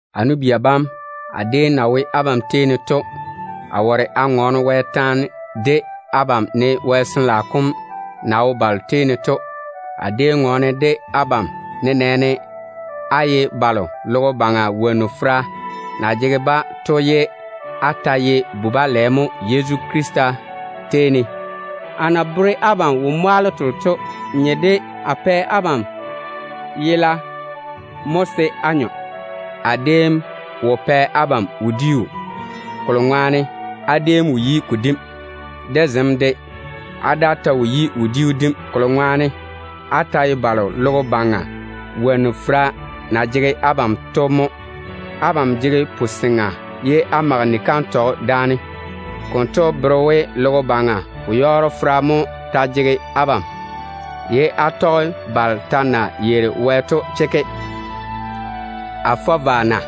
A nu-bia bam, amo déem na wo abam tei ne to, a ware a ŋɔɔne Wɛ taane de abam ne Jworo kom na wo balo tei ne to. A déem ŋɔɔne de abam nenɛɛne á ye balo logo baŋa wonnu fera na jege-ba to ye á ta ye bu-balɛ mo Yezu Krista tei ne. A déem na bere abam wo-mwaalo telo to nye de a pɛ abam nayela mo se á nyɔ. A déem wo pɛ abam wodiu, kolo ŋwaane á déem wo yi ko dim. De zem de, á daa ta wo yi wodiu dim, kolo ŋwaane á ta ye balo logo baŋa wonnu fera na jege-ba to mo. Abam jege wo-goo ye á mage ni-kantɔgɔ daane. Konto bere we logo baŋa wo-yɔɔro fera mo ta jege abam, ye á tɔge balo ta na yeiri Wɛ to kikia. A fɔ vwa na?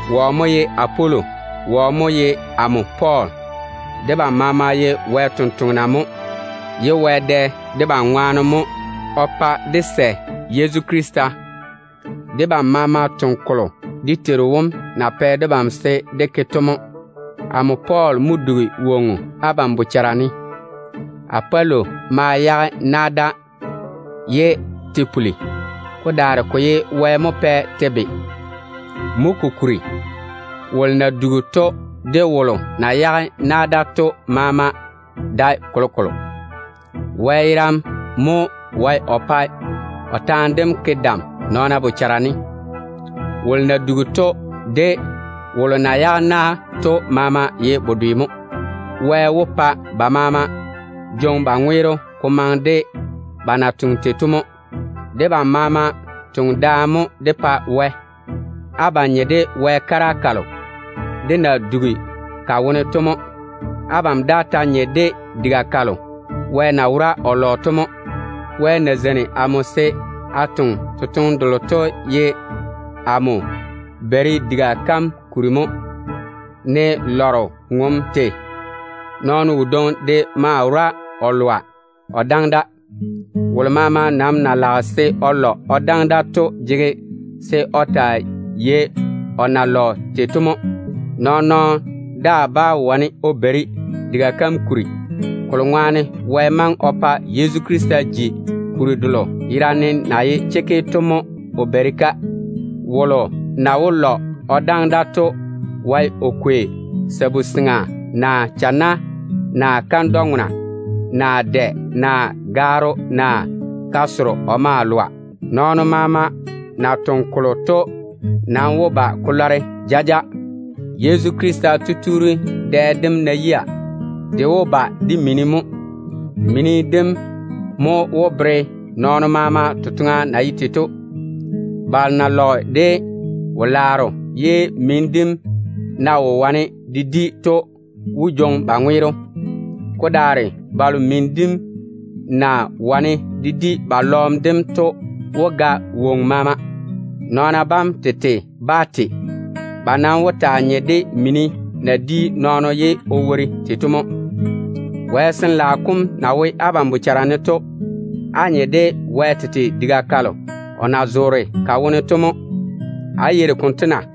Wɔ mo ye Apolo? Wɔ mo ye amo Pɔɔl? Debam maama ye Wɛ tontoŋena mo, ye Wɛ dɛ debam ŋwaane mo o pa á sɛ Yezu Krista. Debam maama toŋe kolo dé Teiru wom na pɛ debam se dé ke to mo. Amo Pɔɔl mo dugi wonnu abam bochara ne. Apolo ma yage na da, ye te puli. Ko daare ko ye Wɛ mo pɛ te be. Mo kokuri, wolo na dugi to, de wolo na yage na da to maama dae kolokolo. Wɛ yerane mo wae o pae o taane dem ke dam nɔɔna bochara ne. Wolo na dugi to de wolo na yage na to maama ye bedwe mo. Wɛ wó pa ba maama jwoŋi ba ŋweero ko maŋe de ba na toŋe tei to mo. Debam maama toŋe daane mo dé pa Wɛ. Abam nye de Wɛ kara kalo dé na dugi ka wone to mo. Abam daa ta nye de diga kalo Wɛ na wora o lɔ to mo. Wɛ na zeini amo se a toŋe totoŋe delo to ye amo beiri diga kam kuri mo, ne lɔro na yei o totoŋa chekke tei to. Nɔɔno wodwoŋi de maa wora o lɔa o daŋe da. Wolo maama nam na lage se o lɔ o daŋe da to jege se o taa yei o na lɔ tei to mo. Nɔɔn-nɔɔno daa bá wane o beiri diga kam kuri, kolo ŋwaane Wɛ maŋe o pa Yezu Krista ji kuri delo yerane na ye chekke to mo o beiri-ka. Wolo na wó lɔ o daŋe da to wae o kwei sabu-seŋa, naa lu-nyenno, naa kandwa-nyenno, naa dɛ, naa ga-korro o maa lɔa. Nɔɔno maama na toŋe kolo to nam wó ba ko lɔre jaja. Yezu Krista tutuuri dɛ dem ná yia, de wó ba de mini mo. Mini dem mo wó bere nɔɔno maama totoŋa na ye tei. Balo na mɛ wo-laaro ba lɔ ye mini dem wo wane de di to wó jwoŋi ba ŋweero. Ko daare balo mini dem na wane de di ba lɔɔm dem to wó ga woŋo maama. Nɔɔna bam tete bá te. Ba nam wó taa nye de mini na di nɔɔno ye o wori tei to mo. Wɛ Jworo kom na wo abam bochara ne to, á nye de Wɛ tete diga kalo o na zoore ka wone to mo. Á yeiri konto na?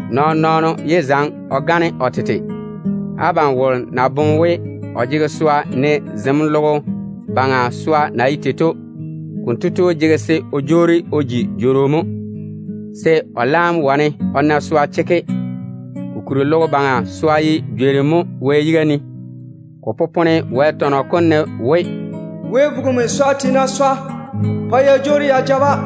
Nɔɔn-nɔɔno yé zaŋe o gane o tete. Abam wolo ná boŋe we o jege swa, ne zem logo baŋa swa na ye tei to, konto tu jege se o jwoori o ji nɔn-jworo mo, se o laam wane o na swa chekke. Kokuri logo baŋa swa yam ye jworim mo Wɛ yiga ne. Ko popone Wɛ tɔnɔ kom ne we, “Wɛ vugimi swa tiina swa yam pa ya jwoori ya ja-ba.”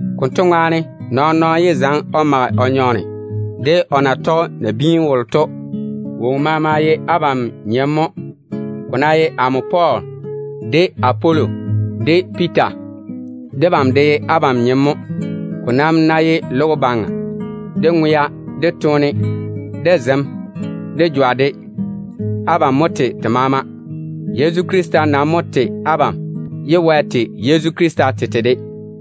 Konto ŋwaane, nɔɔn-nɔɔno yé zaŋe o mage o nyɔɔne de o na tɔge nabiinu wolo to. Woŋo maama ye abam nyem mo. Ko ná ye amo Pɔɔl, de Apolo, de Piita, debam de ye abam nyem mo. Ko nam ná ye logo baŋa, de ŋwea, de toone, de zem, de jwa de, abam mo tei te maama. Yezu Krista nam mo tei abam, ye Wɛ tei Yezu Krista tete de.